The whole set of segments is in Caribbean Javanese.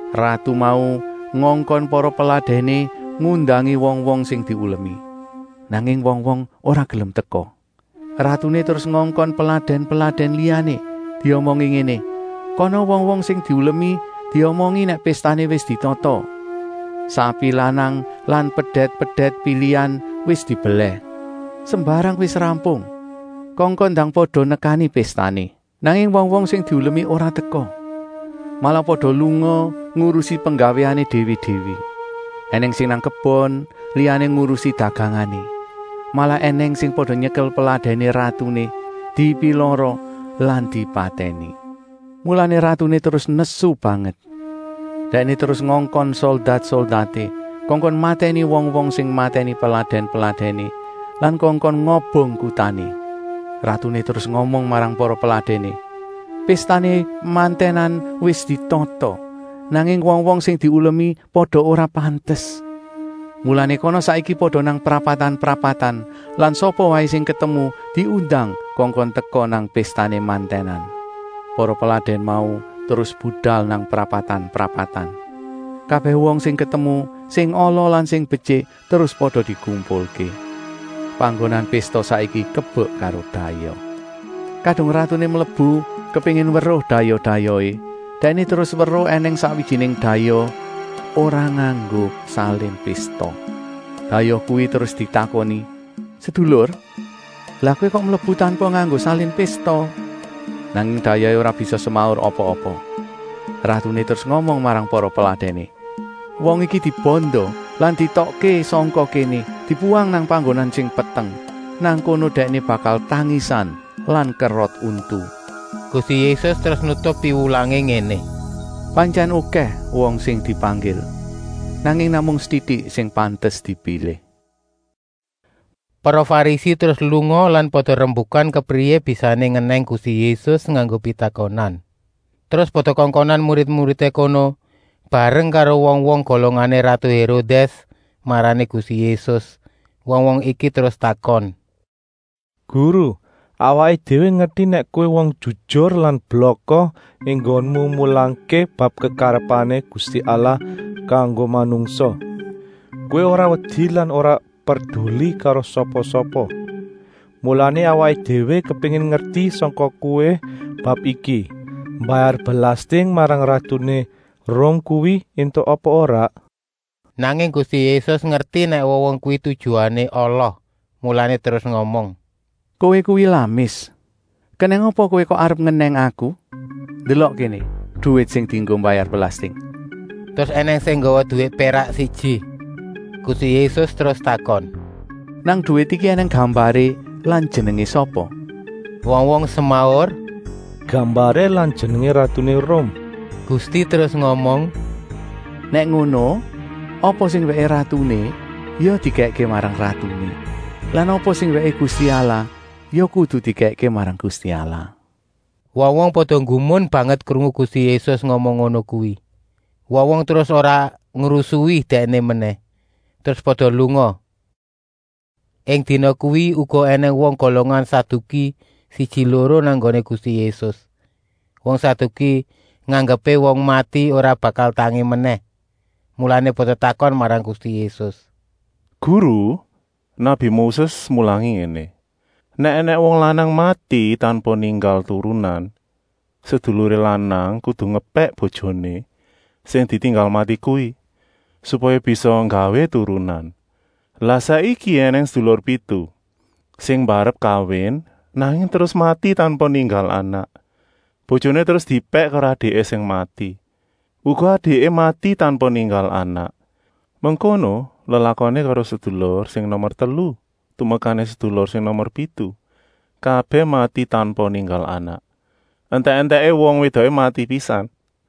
Ratu mau ngongkon para peladèné ngundangi wong-wong sing diulemi. Nanging wong-wong ora gelem teka. Ratuné terus ngongkon peladèn-peladèn liyané, diomongi ngéné: ‘Kana wong-wong sing diulemi diomongi nèk péstané wis ditata. Sapi lanang lan pedèt-pedèt pilihan wis dibelèh. Sembarang wis rampung. Kongkon ndang pada nekani péstané!’ Nanging wong-wong sing diulemi ora teka. Malah pada lunga ngurusi penggawéané déwé-déwé. Enèng sing nang kebon, liyané ngurusi dagangané. Malah ènèng sing pada nyekel peladèné ratuné, dipilara lan dipatèni. Mulané ratuné terus nesu banget. Dèkné terus ngongkon soldat-soldaté, kongkon matèni wong-wong sing matèni peladèn-peladèné lan kongkon ngobong kutané. Ratuné terus ngomong marang para peladèné: ‘Péstané mantènan wis ditata, nanging wong-wong sing diulemi pada ora pantes. Mulané kana saiki pada nang prapatan-prapatan lan sapa waé sing ketemu diundang kongkon teka nang péstané mantènan.’ Para peladèn mau terus budal nang prapatan-prapatan. Kabèh wong sing ketemu, sing ala lan sing betyik, terus pada dikumpulké. Panggonan pésta saiki kebek karo dayoh. “Kadung ratuné mlebu kepéngin weruh dayoh-dayohé, dèkné terus weruh ènèng sakwijiné dayoh ora nganggo salin pésta. Dayoh kuwi terus ditakoni: ‘Sedulur, lah kowé kok mlebu tanpa nganggo salin pésta?’ Nanging dayohé ora bisa semaur apa? Ratuné terus ngomong marang para peladèné: ‘Wong iki dibanda lan dietokké sangka kéné, dibuwang nang panggonan sing peteng. Nang kono dèkné bakal tangisan lan kerot untu.’” Gusti Yésus terus nutup piwulangé ngéné: “Pantyèn okèh wong sing dipanggil, nanging namung setitik sing pantes dipilih.” Para Farisi terus lunga lan pada rembukan kepriyé bisané ngenèng Gusti Yésus nganggo pitakonan. Terus pada kongkonan murid-muridé kono bareng karo wong-wong golongané ratu Hérodès marani Gusti Yésus. Wong-wong iki terus takon: “Guru, awaké déwé ngerti nèk kowé wong jujur lan blaka enggoné mulangké bab kekarepané Gusti Allah kanggo manungsa. Kowé ora wedi lan ora perduli karo sapa-sapa. Mulané awaké déwé kepéngin ngerti sangka Kowé bab iki: mbayar belasting marang ratuné Rum kuwi éntuk apa ora?” Nanging Gusti Yésus ngerti nèk wong-wong kuwi tujuané ala, mulané terus ngomong: “Kowé kuwi lamis. Kenèng apa kowé kok arep ngenèng Aku? Ndelok kéné duwit sing dienggo mbayar belasting.” Terus ènèng sing nggawa duwit pérak siji. Gusti Yésus terus takon: “Nang duwit iki ènèng gambaré lan jenengé sapa?” Wong-wong semaur: “Gambaré lan jenengé ratuné Rum!” Gusti terus ngomong: “Nèk ngono, apa sing wèké ratuné ya dikèkké marang ratuné lan apa sing wèké Gusti Allah ya kudu dikèkké marang Gusti Allah.” Wong-wong pada nggumun banget krungu Gusti Yésus ngomong ngono kuwi. Wong-wong terus ora ngrusui Dèkné menèh, terus pada lunga. Ing dina kuwi uga ènèng wong golongan Saduki siji-loro nang nggoné Gusti Yésus. Wong Saduki nganggepé wong mati ora bakal tangi menèh. Mulané pada takon marang Gusti Yésus: “Guru, nabi Moses mulangi ngéné: ‘Nèk ènèng wong lanang mati tanpa ninggal turunan, seduluré lanang kudu ngepèk bojoné sing ditinggal mati kuwi, supaya bisa nggawé turunan.’ Lah saiki ènèng sedulur pitu. Sing mbarep kawin, nanging terus mati tanpa ninggal anak. Bojoné terus diepèk karo adiké sing mati. Uga adiké mati tanpa ninggal anak. Mengkono lelakoné karo sedulur sing nomer telu tumekané sedulur sing nomer pitu, kabèh mati tanpa ninggal anak. Entèk-entèké wong wédoké mati pisan.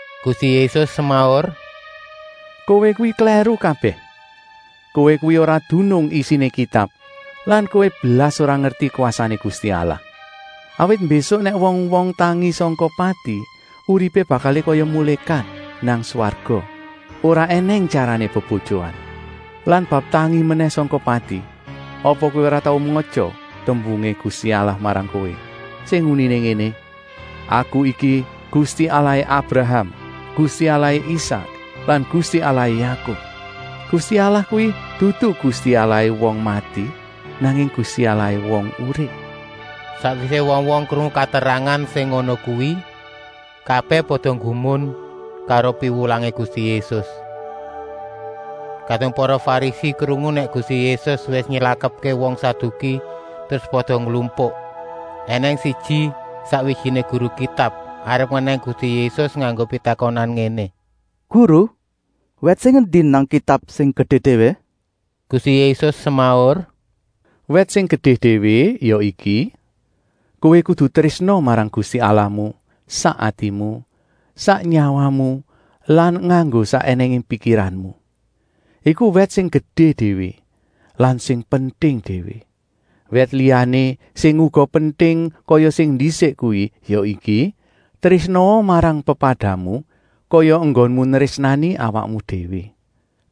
Gusti Yésus semaur: “Kowé kuwi klèru kabèh. Kowé kuwi ora dunung isiné Kitab lan kowé blas ora ngerti kwasané Gusti Allah. Awit mbésuk nèk wong-wong tangi sangka pati uripé bakalé kaya mulékat nang swarga, ora ènèng tyarané bebojoan. Lan bab tangi menèh sangka pati, apa kowé ora tau matya tembungé Gusti Allah marang kowé, sing uniné ngéné: ‘Aku iki Gusti Allahé Abraham, Gusti Allahé Isak lan Gusti Allahé Yakub!’ Gusti Allah kuwi dudu Gusti Allahé wong mati, nanging Gusti Allahé wong urip.” Sakwisé wong-wong krungu katerangan sing ngono kuwi, kabèh pada nggumun karo piwulangé Gusti Yésus. Kadung para Farisi krungu nèk Gusti Yésus wis nylakepké wong Saduki, terus pada nglumpuk. Enèng siji, sakwijiné guru Kitab, arep ngenèng Gusti Yésus nganggo pitakonan ngéné: “Guru, wèt sing endi nang Kitab sing gedé déwé?” Gusti Yésus semaur: “Wèt sing gedé déwé ya iki: Kowé kudu trésna marang Gusti Allahmu sak atimu, sak nyawamu lan nganggo sak ènèngé pikiranmu. Iku wèt sing gedé déwé lan sing penting déwé. Wèt liyané sing uga penting kaya sing ndisik kuwi ya iki: ‘Trésnaa marang pepadamu kaya enggonmu nrésnani awakmu déwé.’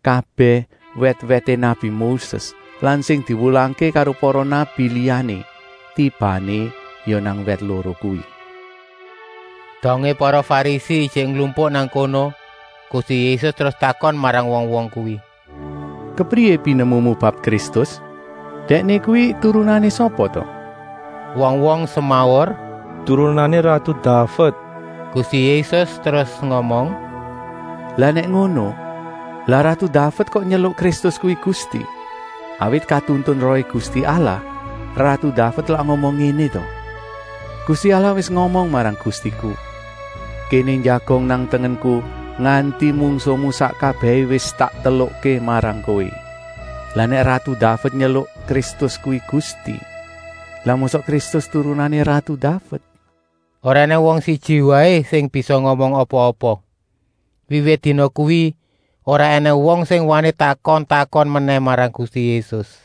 Kabèh wèt-wèté nabi Moses lan sing diwulangké karo para nabi liyané tibané ya nang wèt loro kuwi.” Dongé para Farisi ijik nglumpuk nang kono, Gusti Yésus terus takon marang wong-wong kuwi: “Kepriyé pinemumu bab Kristus? Dèkné kuwi turunané sapa ta?” Wong-wong semaur: “Turunané ratu Daved.” Gusti Yésus terus ngomong: “Lah nèk ngono, lah ratu Daved kok nyeluk Kristus kuwi Gusti? Awit katuntun Rohé Gusti Allah ratu Daved lak ngomong ngéné ta: ‘Gusti Allah wis ngomong marang Gustiku: Kéné njagong nang tengenku, nganti mungsuhmu sak kabèhé wis tak telukké marang kowé.’ Lah nèk ratu Daved nyeluk Kristus kuwi Gusti, lah mosok Kristus turunané ratu Daved?” Ora ènèng wong siji waé sing bisa ngomong apa-apa. Wiwit dina kuwi ora ènèng wong sing wani takon-takon menèh marang Gusti Yésus.